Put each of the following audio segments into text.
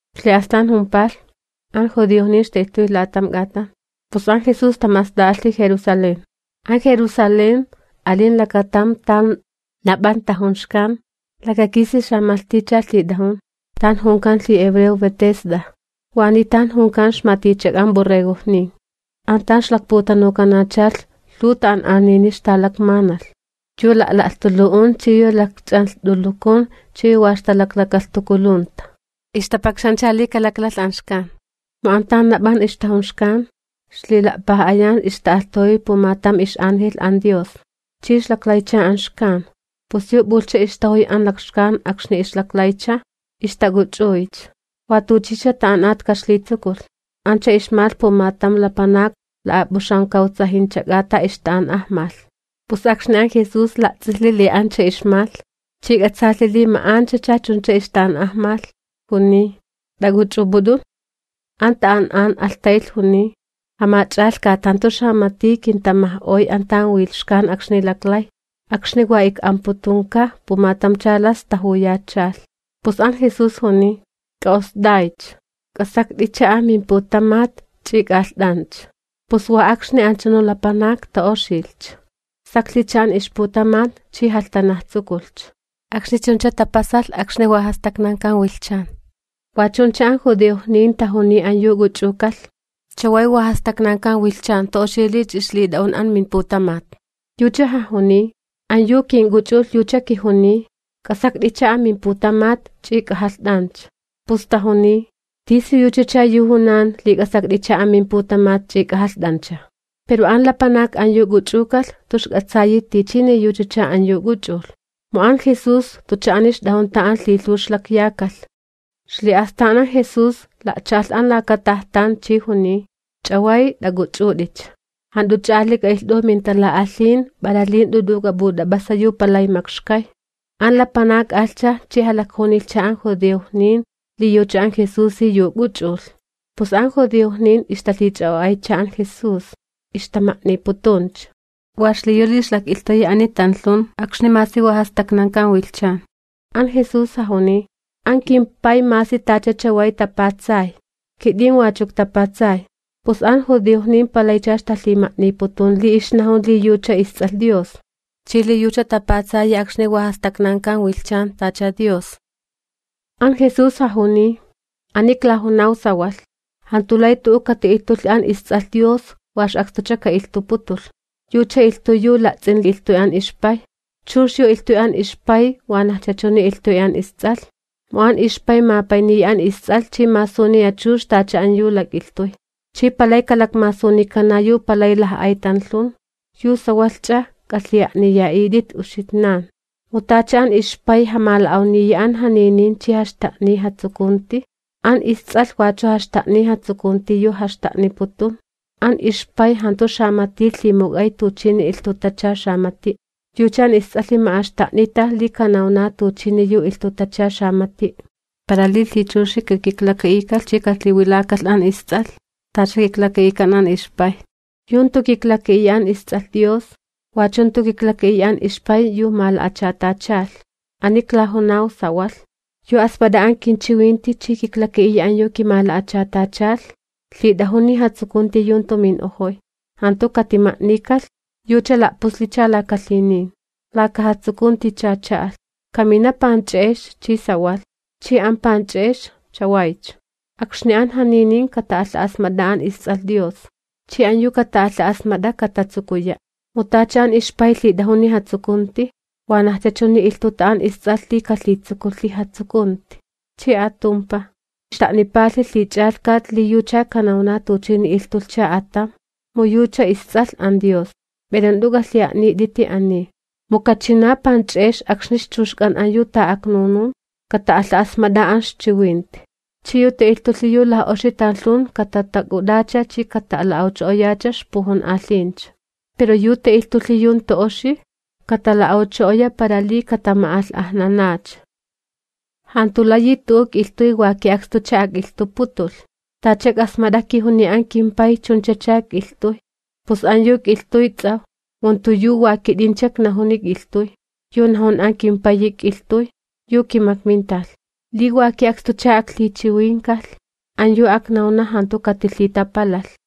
Ixli'astan jumpalh, an judiojnin ixta'ilhtuy la'atam k'atan, pus an Jesús tama'ast'a'alhi Jerusalén. An Jerusalén, alin lakatam tan nap'an tajun xkan, lakakisi xamalhticha lhit'ajun. Tan junkan lhihebreo Betesda. Waniy tan junkan ixmalhtichak'an borregojnin An tan ixlakputanukanachalh, lhuw ta'an'anini ixtalakmanalh, yu la'la'lhtulu'un, yu lakch'anlht'ulukun, chi yu wa ixtalaklakalhtukulunta, ixtapakxancha li kalaklalh an xkan. [ Mu an tan nap'an ixtajun xkan ixlila'paj'ayan ixta'alhtajuy pumatam angelh chi ixlaklaycha an xkan, pus yu p'ulhcha ixtajuy an lakxkan akxni ixlaklaycha, ixtak'uch'uycha, wa tuchicha ta'an'at kaxlitsukulh.] Ancha ixmalh pumatam lapanak la'ap'uxamkawtsajincha k'ata ixta'an'ajmalh. Pus akxni an Jesús la'ts'ilhi li ancha ixmalh, chi k'atsaalhi li ma'anchacha chuncha ixta'an'ajmalh, juniy: ―¿T'ak'uch'up'ut'un? An ta'an'an alhtaylh juniy: ―Jamach'alhkat, jantu xamati kintamaj'oy an tan wilh xkan akxni laklay, akxni wa ik'amputunka pumatamcha las tajuyachalh. Pus an Jesús juniy: ―K'a'ost'aycha, k'asakt'icha amimputamat ch'i k'ajalht'ancha. Pus wa akxni anchunu lapanak ta'oxilhcha, saklhicha an ixputamat chi jalhtanajtsukulhcha. Akxni chuncha tapasalh, akxni jantu tapatsakan wilhchan. Wa chuncha an judiojnin tajuniy an yu k'uch'uk'alh: ―Chaway wa jastaknankan wilhchan, jantu oxi li ch'ixlit'a'un amimputamat. Yucha jajuniy: ―An yu kink'uch'ulh yucha kijuniy: “K'asakt'icha amimputamat ch'i k'ajalht'ancha.” Pus tajuniy: ―¿Tisiyuchacha yu junan li: “K'asakt'icha mimputamat ch'i k'ajalht'ancha”? Pero an lapanak an yu k'uch'ukalh jantu ixk'atsayi tichini yuchacha an yu k'uch'ulh, mu an Jesús jantucha ani ixt'ajun an tan lhilhuw ixlakyakalh. Ixli'astan an Jesús la'cha'alh an laka tajtan chi juniy: ―Chaway t'ak'uch'ut'icha, jant'uch'a ali k'a'ilht'u mintala'alhin para li jant'u t'u'u k'ap'ut'ap'asa yu palay makxkay. An lapanak alhcha chi jalakjunilhcha an judiojnin li yucha an Jesusi yu k'uch'ulh. Pus an judiojnin ixtalhich'a'o'aycha an Jesús, ixtama'niputuncha, wa xliyu li ixlak'ilhtuyi ani tanlhun akxni masi wa jastaknankan wilhchan. An Jesús jajuniy: ―An kimPay masi tacha chaway, tapatsay, kit'in wachu iktapatsay. Pus an judiojnin palaycha ixtalhima'niputun li ixnajun li yucha isTs'alh Dios, chi li yucha tapatsayi akxni jantu tapatsakan wilhchan, tacha Dios. An Jesús jajuniy: ―Ani klajunaw sawalh: Jantu lay tu'u kati'ilhtulhi an isTs'alh Dios wa ix'akstucha ka'ilhtuputulh, yucha ilhtuy yu la'ts'in ilhtuy an ixPay. Chux yu ilhtuy an ixpay wanajcha chuni ilhtuy an Ists'alh. Mu an ixPay mapayniya an isTs'alh chi masuniya chux tacha an lak'ilhtuy. Chi palay kalakmasunikana yu palay laj'ay tanlhun, yu sawalhch'a k'alhi'a'niya'it'it uxitnan. Mu tacha an ixPay jamala'awniya an janinin chi jaxta'niya jatsukunti, an isTs'alh wachu jaxta'niya jatsukunti yu jaxta'niputun. An ixPay jantu xamati lhimuk'ay tuchini ilhtutacha xamati', yucha an isTs'alhi ma'axta'nita li kanawna tuchini yu ilhtutacha xamati'. Para li lhichuxi kakiklaka'ikalh chi kalhiwilakalh an isTs'alh tacha kiklaka'ikan an ixPay. Yu jantu kiklaka'iya an isTs'alh Dios, wachu jantu kiklaka'iya an ixPay, yu mala'achatachalh. ’Ani iklajunaw sawalh: Yu asmat'a an kinchiwinti chi kiklaka'iya an yu kimala'achatachalh lhit'ajuni jatsukunti yu jantu min'ojoy, jantu katimama'alh'ajnikalh, yucha la'puslicha laka lhinin, laka jatsukunticha cha'alh. Kamina panch'e'ex chi sawalh, chi an panch'e'ex chawaycha, akxni an janinin kata'alha'asmat'a an isTs'alh Dios. Chi an yu kata'alha'asmat'a katatsukuya'. Mu tacha an ixPay lhit'ajuni jatsukunti, wanajcha chuni ilhtuta an isTs'alh li kalhitsukulhi jatsukunti. Chi atumpaj, xta'nipalhi lhich'alhkat li yucha kanawna tuchini ilhtulhcha atam, mu yucha isTs'alh Dios. Pero jant'u k'alhi'a'nit'iti ani, mu kachina panch'e'ex akxni ixchuxk'an an yu ta'aknunun kata'alha'asmat'a an ixchiwinti. Chi yu ta'ilhtulhi yu oxi tanlhun katatak'ut'acha chi katala'awcho'oyacha ixpujun'alhincha. Pero yu ta'ilhtulhi yu jantu oxi, katala'awcho'oya para li katama'alh'ajnanacha. ’Jantu layi tu'u k'ilhtuy yu wa ki'akstucha ak'ilhtuputulh. Tacha ik'asmat'a kijuniy an kimPay chunchacha ik'ilhtuy, pus an yu ik'ilhtuy ts'awj, mu jantu yu wa kit'incha iknajuni ik'ilhtuy, yu najun an kimPayi ik'ilhtuy, yu kimakminta. Li wa ki'akstucha aklhichiwinkalh, an yu aknawna jantu katilhitapalalh.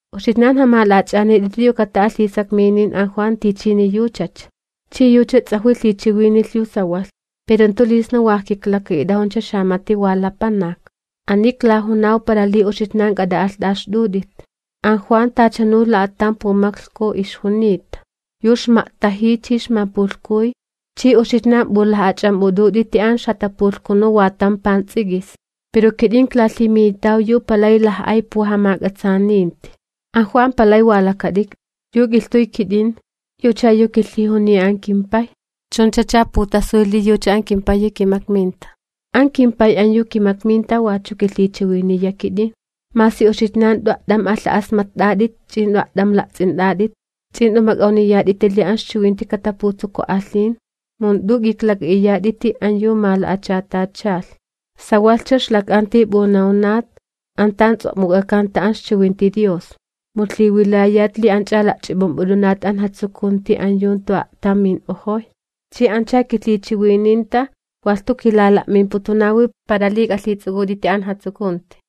Uxitnan jamala'ach'anit'iti yu kata'alh lhisakminin an Juan tichini yuchacha, chi yucha ts'ajwi lhichiwinilh yu sawalh. Pero jantu li sna wa ijkiklaka'it'ajuncha xamati wa lapanak, ani iklajunaw para li uxitnan k'at'a'alht'axt'ut'it. An Juan tachanu la'atam pumaklhku ixjunita, yu ixma'tajiy chi ixmapulhkuy, chi uxitnan p'ulaj'ach'amp'ut'unt'iti an ixjatapulhkunu wa tam pants'ik'is. Pero kit'in iklalhiminitaw yu palay laj'ay pujamak'atsaaninti, an Juan palay wa lakat'ikt'i. Yu ik'ilhtuy kit'in, yucha yu kilhijuniy an kimPay, chunchacha putasuy li yucha an kimPayi kimakminta. An kimPay an yu kimakminta wachu kilhichiwiniya kit'in, masi uxitnan jant'u a't'am alha'asmatt'at'it ch'i jant'u a't'am la'ts'int'at'it. Ch'i jant'u mak'awniyat'iti li an ixchiwinti kataputsuku'alhin, mu jant'u k'iklak'a'iyat'iti an yu mala'achatachalh. Sawalhcha ixlak'anti p'unawnat an tan ts'o'muk'akanta an ixchiwinti Dios, mu lhiwilayat li anch'a la'ch'ip'imp'ut'unat an jatsukunti yu jantu a'tam min'ojoy, chi ancha kilhichiwininta. Walh jantu kilala'mimputunawi para li k'alhits'uk'ut'iti an jatsukunti.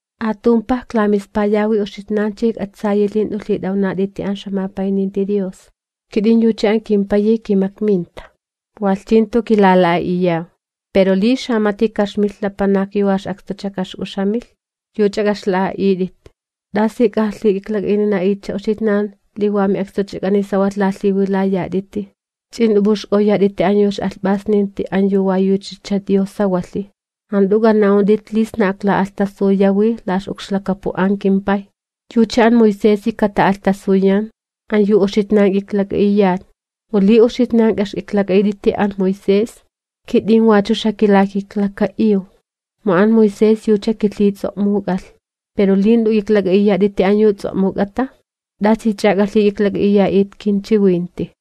Atumpaj iklamispayawi uxitnan chi ijk'atsayi li jant'u lhit'awnat'iti an ixjamapayninti Dios. Kit'in yucha an kimPayi kimakminta, walh chi jantu kilala'a'iyaw. Pero li xamati lapanak ka'ixmilh yu wa ix'akstucha ka'ixk'uxamilh, yuch'a k'a'ixla'a'it'it. ¿Tasich'a k'ajalhik'iklak'a'inina'it uxitnan li wa mi'akstuchak'ani sawalh lalhiwilayat'iti, ch'i jant'u p'uxk'awyat'iti yu ix'alhp'asninti an yu wa yuchacha Dios sawalhi? Jant'u k'ana'unt'it li sna akla'alhtasuyawi la ix'ukxlakapu an kimPay. Yucha an Moisesi kata'alhtasuyan, an yu k'iklak'a'iyat uxitnan. Mu li uxitnan k'a'ixk'iklak'a'it'iti an Moisés, kit'in wachu xakilakiklaka'iw, mu an Moisés yucha kilhits'o'muk'alh. Pero li jant'u k'iklak'a'iyat'iti an yu ts'o'muk'ata, ¿t'asich'a k'alhik'iklak'a'iya'it kinchiwinti?